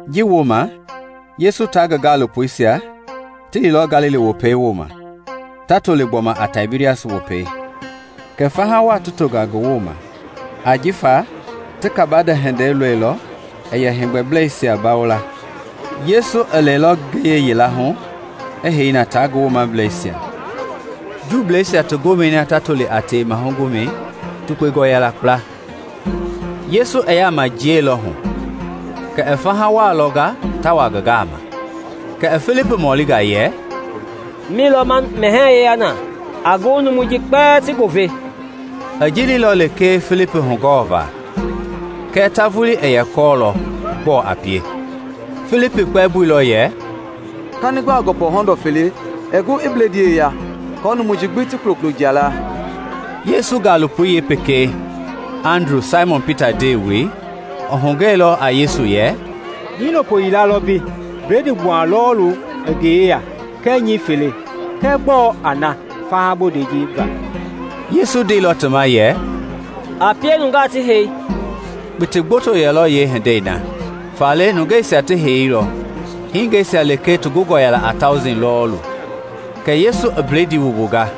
Ji wooma Yesu tia ngi gaalopoisia ti liilɔ Galili Wopɛi wooma (ta toli gbɔma a Taibirias Wopɛi). Ke faha waa i tonga ngi ma ajifa ti kabande welei lɔilɔ i yɛ heegbɛbleisia bawo la. Yesu i lɛilɔ ngiye yila hu i hei na tia ngi gaalopoisia. Juuisia ti gomɛi na ta toli a Tewema Gomɛi, tukpengɔ yɛla kpla. Yesu i yaama jiɛilɔ hu kɛ i faha waa lɔnga ta wa ngi gama, kɛ i Filipi mɔlinga yɛ, “Mi lɔ ma mɛhɛɛ yeya na a gu numui ji kpɛlɛɛ ti goo ve?” I ji leilɔ lekee Filipi hugɔɔva kɛɛ ta vulii i yɛ kɔɔlɔ gbɔɔ a pie. Filipi kpɛmboilɔ yɛ, “Kani gbaa gɔpɔ hɔndɔ fele ɛɛ gu i bledii yeya aako numui ji gbi ti kulokulo jia laa.” Yesu gaalopoi yeepekei, Andru, Saimɔn Pita ndewei, i hugɛi lɔ a Yesu yɛ, “Hiilopo yilalɔ mbei bledii gbuha lɔɔlu i ngi yeya kɛɛ nyɛɛ fele, kɛɛ gbɔɔ a na faha bondei ji va?” Yesu i ndeilɔ ti ma yɛ, “A pie nungaa ti hei.” Kpiti gboto yɛlɔ yeehindei na; faale nungeisia ti heiilɔ, hingeisia lekee ti gungɔ a Tauji lɔɔlu. Kɛ Yesu i blediisia wumbunga,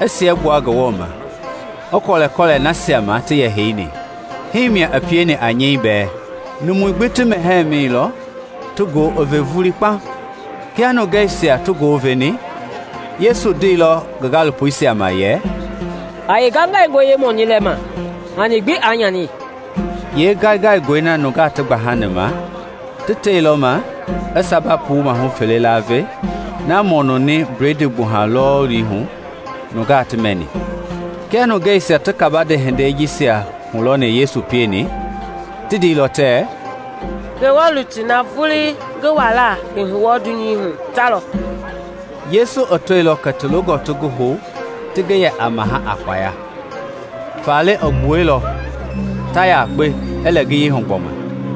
i siɛgbua Ngewɔ ma, i kɔlɛkɔlɛ nasia ma ti yɛ heini; hii i pieni a nyɛi bɛɛ, numui gbi ti mɛhɛɛi na mɛ ti goo i ve vulii kpaŋ. Kia nungeisia ti goo i veni, Yesu ndeilɔ ngi gaalopoisia ma yɛ, “A yeengaingaingɔi yeemɔnii lɛma, hani gbi aa nyani.” Yeengaingaingɔi na nungaa ti gbahani ma, ti teilɔ ma i samba puu maahu fele laave na mɔnuni bledii gbuha lɔɔlui hu nungaa ti mɛni. Kia nungeisia ti kabande hindei ji hulɔni Yesu i pieni, ti ndeilɔ tɛɛ, “Ngewɔ lutui na vulii ngi walaa i hu wɔɔ dunyei hu ta lɔ!” Yesu i tɔilɔ kɛ ti longɔ ti ngi hou ti ngi yɛ a mahɛi a kpaya, faale i gbuɛilɔ, ta yakpe, i lɛ ngiyei hu gbɔma.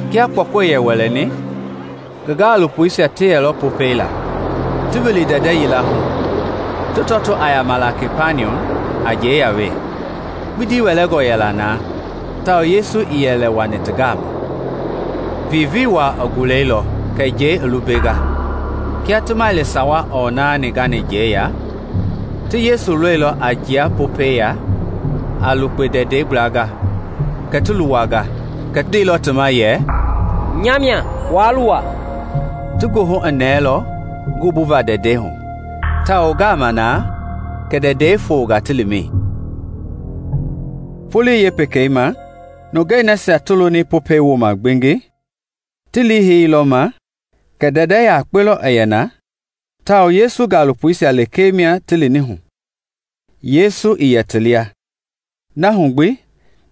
Kia kpɔkɔ i wɛlɛni, ngi gaalopoisia ti yeilɔ Popɛi laa, ti wili ndɛndɛ yila hu, ti tɔtoo a yamala Kapaniɔm a njɛi ya wee. Kpindi wɛlɛngɔ yɛla na tawao Yesu ii yɛ lɛ wani ti gama. Vivii waa i gulɛilɔ kɛ njɛi i lumbenga. Kia ti maili sawa ɔɔ naani gani njɛi ya, ti Yesu lɔilɔ a jia Popɛi ya a lukpe ndɛndɛi gbla kɛ ti luwanga, kɛɛ i ndeilɔ ti ma yɛ, “Nya mia; waa luwa.” Ti goohu i nɛɛlɔ ngi wumbuva ndɛndɛi hu tawao ngaamɛi na kɛ ndɛndɛi i fonga ti limɛi. Folo wekei ma, nungei nasia ti loni Popɛi wooma gbengi, ti liiheilɔ ma kɛ ndɛndɛ yakpe lɔ i yɛ na tawao kɛ Yesu gaalopoisia lekee lɔ ti lini hu, Yesu ii yɛ ti lia. Na hu gbi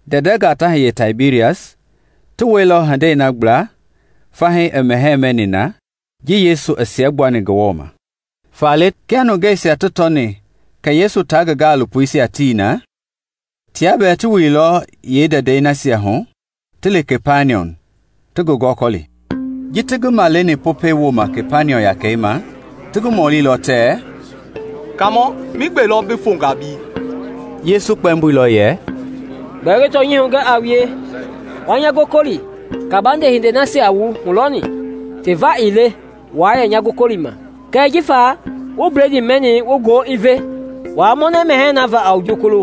ndɛndɛngaa ta hiye Taibirias ti wɛilɔ hindei na gbla fahii i mɛhɛɛ mɛni na ji Yesu i siɛgbuani Ngewɔ ma. Faale kia nungeisia ti tɔni kɛ Yesu tia ngi gaalopoisia tii na, tia bɛɛ ti wililɔ yeendɛndɛisia hu ti li Kapaniɔm ta ngi gɔkɔli. Ji ti ngi maleni Popɛi wooma Kapaniɔm yakɛi ma, ti ngi mɔlilɔ tɛɛ, “Kaamɔ, migbe lɔ bi fonga mbei?” Yesu kpɛmboilɔ yɛ, “Gbɛɛ ngi tɔnyɛi hugɛ a wue, wa nya gɔkɔli, kabande hindei nasia wu hulɔni ti va ii le wua yɛ nya gɔkɔlima, kɛɛ jifa wu bledii mɛni wu goo i ve. Waa mɔnɛ mɛhɛɛi na va a jukulu,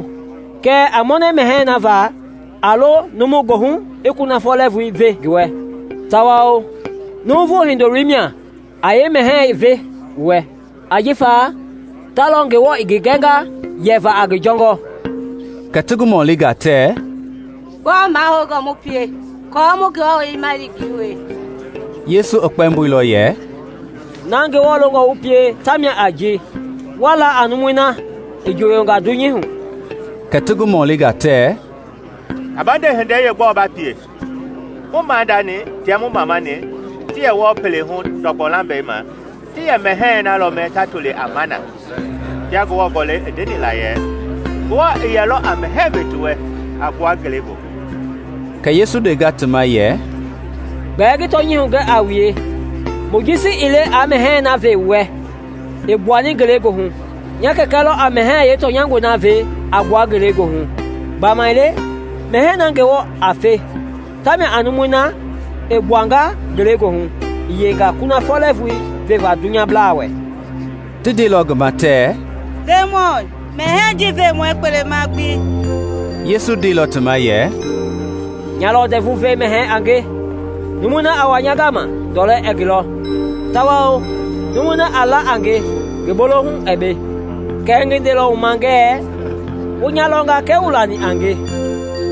kɛɛ a mɔnɛ mɛhɛɛi na va a lo numu goohu i kunafɔ lɛɛvui ve ngi wɛ, tawao Nuuvu Hindoloi mia a yeemɛhɛi ve wu wɛ, ajifa ta lɔ Ngewɔ i ngi gɛnga yɛva a ngi jɔngɔ.” Kɛ ti ngi mɔlinga tɛɛ, “Gbɔɔ mahoungɔ mu pie aako mu Ngewɔ liima yengei wie?” Yesu i kpɛmboilɔ yɛ, “Na Ngewɔ longɔ wu pie tamia a ji wa la a numui na i njooyonga dunyei hu.” Kɛ ti ngi mɔlinga tɛɛ, “Kabande hindei yeegbɔɔ ba pie? Mu maadani tia mu mamani ti yɛ wɔɔ pele hu ndɔgbɔ lambɛi ma ti yɛ mɛhɛɛi na lɔ mɛ ta toli a mana, kia Ngewɔ Gɔlɛi i ndeni la yɛ, ‘Ngewɔ i yɛlɔ a mɛhɛɛ ve ti wɛ a gbua ngele goohu.’” Kɛ Yesu i ndenga ti ma yɛ, “Gbɛɛ ngi tɔnyɛi hugɛ a wue, Mojisi ii le aa mɛhɛɛi na ve wu wɛ i gbuani ngelegoohu; nya Kɛkɛ lɔ a mɛhɛɛi yeetɔnyangɔi na ve a gbua ngelegoohu. Gbamaile mɛhɛɛi na Ngewɔ a fe tamia a numui na i gbuanga ngelegoohu i yeinga kunafɔ lɛɛvui veva dunyablaa wɛ.” Ti ndeilɔ ngi ma tɛɛ, “Ndemɔi, mɛhɛɛi ji ve mu wɛ kpelema gbi.” Yesu ndeilɔ ti ma yɛ, “Nya lɔ ndɛvu ve mɛhɛɛi a nge; numui na a wa nya gama ndɔlɛ ɛɛ ngi lɔ, tawao numui na a la a nge ngi bolohu ɛɛ be. Kɛɛ ngi ndeilɔ wu ma ngɛɛ wu nya lɔnga kɛɛ wuii lani a nge.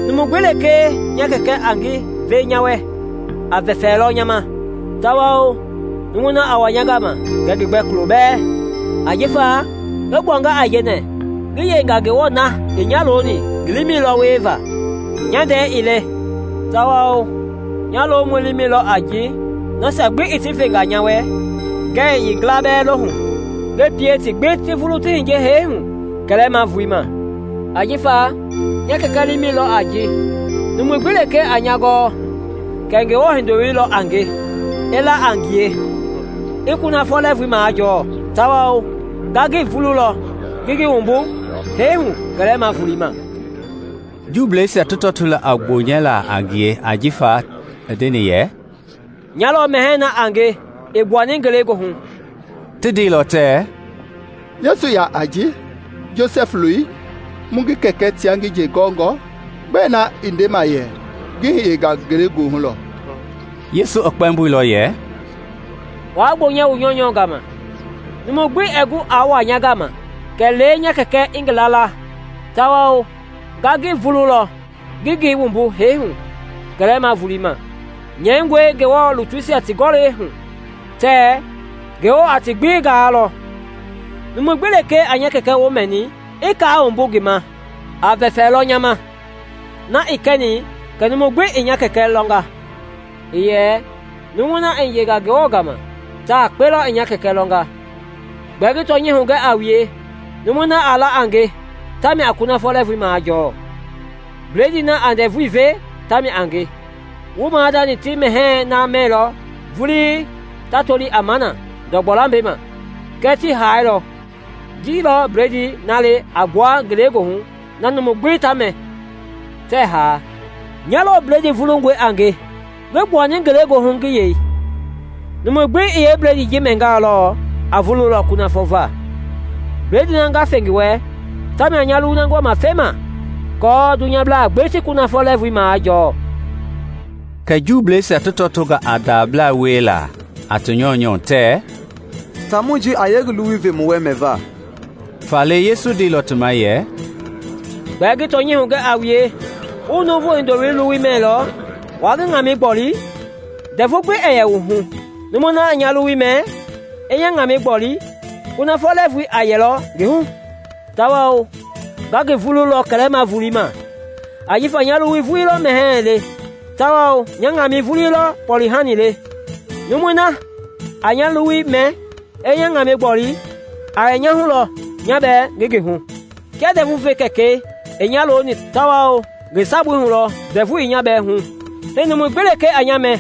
Numu gbi lekee nya Kɛkɛ a ngi ve nya wɛ, a vɛfɛlɔ nya ma; tawao numui na a wa nya gama ngɛɛ ngi gbɛ kulo bɛɛ. Ajifa ngi gbuanga aijɛnɛ ngi yeinga Ngewɔ na i nya loni ngi liimɛi lɔ wieva, nya ndɛi ii le; tawao nya lomɔi liimɛi lɔ a ji nasia gbi i ti venga nya wɛ ngɛɛ yeengila bɛɛ lohu, ngi pie ti gbi ti vulu ti hiye hee hu kɛlɛma volei ma. Ajifa nya Kɛkɛi liimɛi lɔ a ji numu gbi lekee a nya gɔɔ kɛ Ngewɔ Hindoloi lɔ a nge, i la a ngie, i kunafɔ lɛɛvui majɔɔ; tawao nga ngi vululɔ ngi ngi wumbu hee hu kɛlɛma volei ma.” Juuisia ti tɔtoilɔ a gbonyɛla a ngie ajifa i ndeni yɛ, “Nya lɔ mɛhɛɛi na a nge i gbuani ngelegoohu.” Ti ndeilɔ tɛɛ, “Yesu yaa a ji, Josɛf loi, mu ngi kɛkɛ tia ngi nje gɔngɔ? Gbɛe na i ndema yɛ, ‘Ngi hiyenga ngelegoohu lɔ?’” Yesu i kpɛmboilɔ yɛ, “Waa gbonyɛ wu nyɔunyɔ gama. Numu gbi ɛɛ gu aa wa nya gama kɛlee nya Kɛkɛi a ngi laala; tawao nga ngi vululɔ ngi ngi wumbu hee hu kɛlɛma volei ma. Nyɛingɔe Ngewɔ lutuisia ti Gɔlɛi hu tɛɛ, ‘Ngewɔ a ti gbi gaalɔ.’ Numu gbi lekee a nya Kɛkɛi woo mɛni, i kaa wumbu ngi ma, a vɛfɛlɔ nya ma. Na ii kɛni kɛ numu gbi i nya Kɛkɛi lɔnga; iiyɛ numui na i hiyenga Ngewɔ gama, ta yakpe lɔ i nya Kɛkɛi lɔnga. Gbɛɛ ngi tɔnyɛi hugɛ a wue, numui na a la a nge tamia a kunafɔ lɛɛvui majɔɔ. Bledii na a ndɛvui ve tamia a nge. Wu maadani ti mɛhɛɛi na mɛilɔ vulii ta toli a mana ndɔgbɔ lambɛi ma, kɛɛ ti haailɔ. Ji lɔ bledii na le a gbua ngelegoohu na numu gbi ta mɛ, tɛɛ haa. Nya lɔ bledii vulungɔi a nge ngi gbuani ngelegoohu ngi yei; numu gbi i yeebledii ji mɛngalɔ, a vululɔ kunafɔ va. Bledii na nga fe ngi wɛ tamia a nya luwui na ngi wama fema aako dunyablaa gbi ti kunafɔ lɛɛvui majɔɔ.” Kɛ Juuisia ti tɔtonga a ndablaa wiela a ti nyɔunyɔ tɛɛ, “Taamɔi ji a yee ngi luwui ve mu wɛ mɛva?” Faale Yesu i ndeilɔ ti ma yɛ, “Gbɛɛ ngi tɔnyɛi hugɛ a wue, wuii Nuuvu Hindoloi luwui mɛilɔ, waa ngi ŋamɛi gboli, ndɛvu gbi ɛɛ yɛ wu hu; numui na a nya luwui mɛ, i nya ŋamɛi gboli, kunafɔ lɛɛvui a yɛlɔ ngi hu, tawao nga ngi vululɔ kɛlɛma volei ma. Ajifa nya luwui vulii lɔ mɛhɛɛ le tawao nya ŋamɛi vulii lɔ kpɔle-hani le. Numui na a nya luwui mɛ, i nya ŋamɛi gboli, a yɛ nya hu lɔ, nya bɛɛ ngi ngi hu. Kia ndɛvu ve Kɛkɛi i nya loni tawao ngi sabui hu lɔ ndɛvu i nya bɛɛ hu, hii numu gbi lekee a nya mɛ,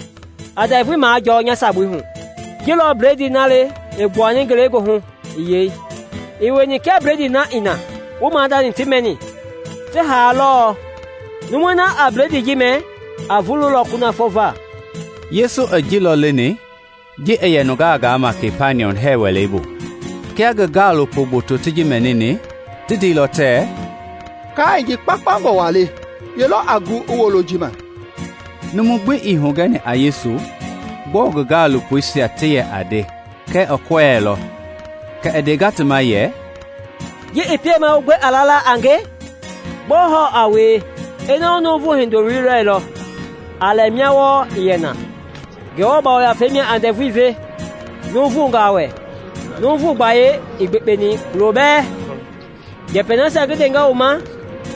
a ndɛvu majɔɔ nya sabui hu. Ji lɔ bledii na le i gbuani ngele goohu i yei, ii wieni kia bledii na i na wu maadani ti mɛni, ti haa lɔɔ. Numui na a bledii ji mɛ, a vululɔ kunafɔ va.” Yesu i ji lɔ leni ji i yɛ nungaa gaama Kapaniɔm hɛɛ wɛlei bu. Kia ngi gaalopo gboto ti ji mɛnini, ti ndeilɔ tɛɛ, “Kaai ji kpaukpaungɔ waa le; ye lɔ a gu i wolo ji ma?” Numu gbi ii hugɛni a Yesu gbɔɔ ngi gaalopoisia ti yɛ nde kɛɛ i kɔɛilɔ, kɛ i ndenga ti ma yɛ, “Ji i piemaa wu gbe a lala a nge? Gbɔɔ hɔɔ a wie ina wu Nuuvu Hindoloi lɔilɔ a lɛ mia wɔɔ i yɛ na? Ngewɔ Yafei mia a ndɛvui ve nuuvungaa wɛ; nuuvu gbayei ii gbekpeni kulo bɛɛ. Njɛpɛi nasia ngi ndenga wu ma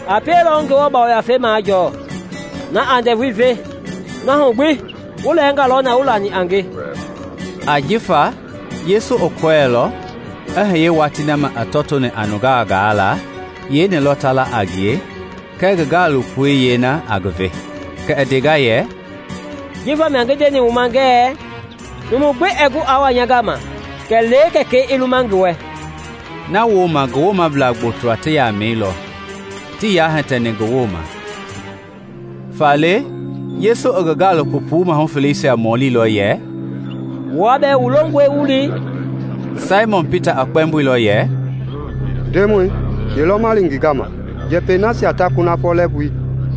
a pielɔ wu Ngewɔ Yafei majɔɔ na a ndɛvui ve. Na hu gbi wu lɛɛnga lɔ na wuii lani a nge.” Ajifa Yesu i yɛ kɔɔlɔ i hiye watii na ma i tɔtoni a nungaa gaala yeeni lɔ ta la a ngie kɛɛ ngi gaalopoi yeena a ngi ve. Kɛ i ndenga yɛ, “Ji vamia ngi ndeni wu ma ngɛɛ numu gbi ɛɛ gu aa wa nya gama kɛlee Kɛkɛi i luma ngi wɛ.” Na wooma ngi woomablaa gboto ti yamɛilɔ, tii yaa hitɛni ngi wooma. Faale Yesu i ngi gaalopo puu maaha feleisia mɔlilɔ yɛ, “Wua bɛɛ wu longɔe wu li?” Saimɔn Pita i kpɛmboilɔ yɛ, “Ndemɔi, ye lɔ ma li ngi gama? Njɛpɛi nasia ta kunafɔ lɛɛvui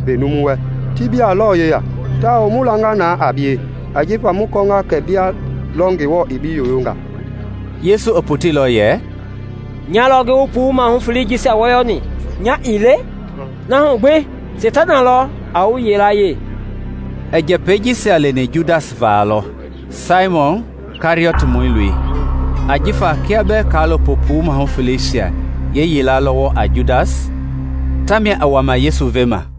ve numu wɛ ti bia lɔ yeya; tawao mu langa na a bie, ajifa mu kɔɔnga kɛ bia lɔ Ngewɔ i bi yoyonga.” Yesu i poteilɔ yɛ, “Nya lɔ ngi wu puu maahu felei jisia wɔyɔ ni. Nya ii le? Na hu gbi seitana lɔ a wu yilayee!” I njɛpɛi ji leni Judas va lɔ, Saimɔn Kɛriɔtmɔi loi; ajifa kia bɛɛ kaalopo puu maahu feleisia yilayee lɔ wɔɔ a Judas, tamia i wama Yesu vema.